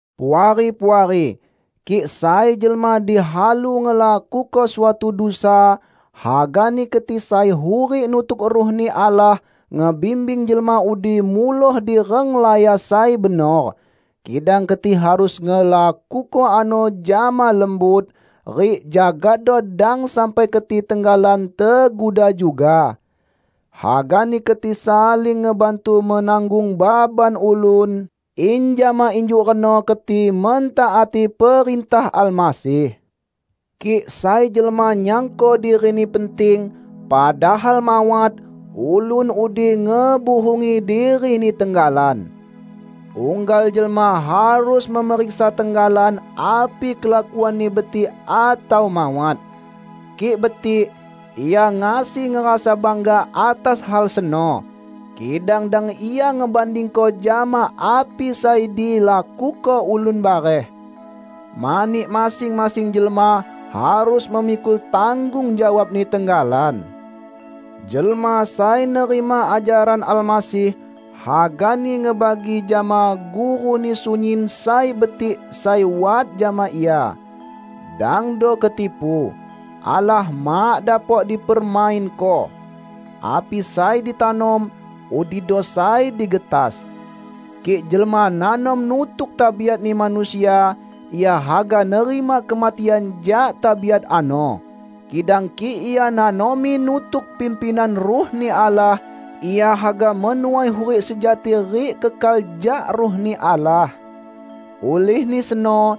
Puari-puari! Kik sai jelma dihalu ngelakuko suatu dusa, hagani keti sai hurik nutuk Ruh-Ni Allah, ngebimbing jelma udi muloh di renglaya sai benor. Kidang keti harus ngelakuko ano jama lembut, rik jagado dang sampai keti tenggalan teguda juga. Hagani keti saling ngebantu menanggung baban ulun, in jama injuk reno keti mentaati perintah Almasih. Kik sai jelma nyangko dirini penting, padahal mawat, ulun udi ngebuhungi dirini tenggalan. Unggal jelma harus memeriksa tenggalan api kelakuanni betik atau mawat. Kik betik, ia ngasi ngerasa bangga atas hal seno. Kidang dang ia ngebandingko jama api sai dilakuko ulun bareh. Mani masing-masing jelma harus memikul tanggung jawabni tenggalan. Jelma sai nerima ajaran Almasih, hagani ngebagi jama guruni sunyin sai betik sai wat jama ia. Dangdo ketipu. Allah mak dapok dipermainko! Api sai ditanom, udido sai digetas. Kik jelma nanom nutuk tabiatni manusia, ia haga nerima kematian jak tabiat ano. Kidang kik ia nanomi nutuk pimpinan Ruh-Ni Allah, ia haga menuai hurik sejati rik kekal jak Ruh-Ni Allah. Ulihni seno,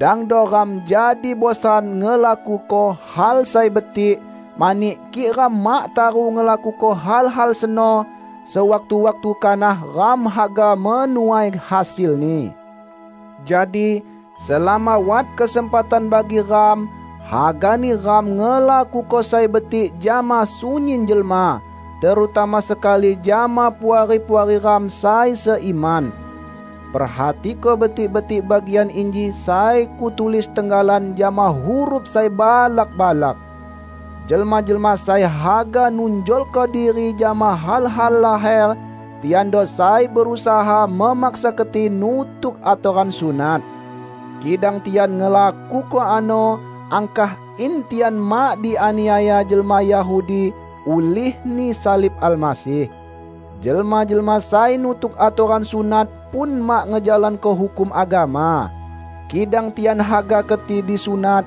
dangdo ram jadi bosan ngelakuko hal sai betik; mani kik ram mak taru ngelakuko hal-hal seno sewaktu-waktu kanah ram haga menuai hasilni. Jadi, selama wat kesempatan bagi ram, hagani ram ngelakuko sai betik jama sunyin jelma, terutama sekali jama puari-puari ram sai seiman. Perhatiko betik-betik bagian inji sai kutulis tenggalan jama huruf sai balak-balak. Jelma-jelma sai haga nunjolko diri jama hal-hal laher, tiando sai berusaha memaksa keti nutuk atoran sunat. Kidang tian ngelakuko ano angkah in tian mak dianiaya jelma Yahudi ulihni salib Almasih. Jelma-jelma sai nutuk atoran sunat pun mak ngejalanko hukum agama. Kidang tian haga keti disunat,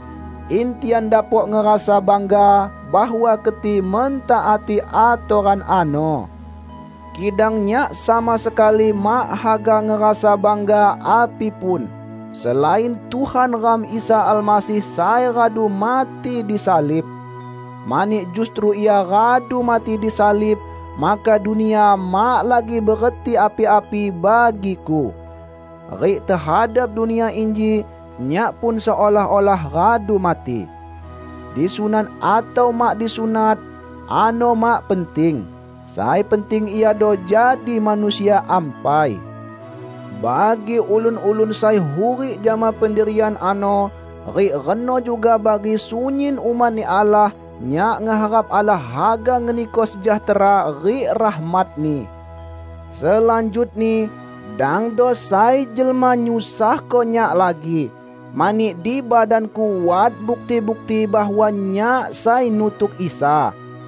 in tian dapok ngerasa bangga bahwa keti mentaati atoran ano. Kidang nyak sama sekali mak haga ngerasa bangga api pun, selain Tuhan ram Isa Almasih sai radu mati disalib. Mani justru Ia radu mati disalib, maka dunia mak lagi bereti api-api bagiku. Rik tehadap dunia inji, nyak pun seolah-olah radu mati. Disunat atau mak disunat, ano mak penting. Sai penting iado jadi manusia ampai. Bagi ulun-ulun sai hurik jama pendirian ano, rik reno juga bagi sunyin umat-Ni Allah, nyak ngeharap Allah haga ngeniko sejahtera rik rahmat-Ni. Selanjutni, dangdo sai jelma nyusahko nyak lagi, mani di badanku wat bukti-bukti bahwa nyak sai nutuk Isa.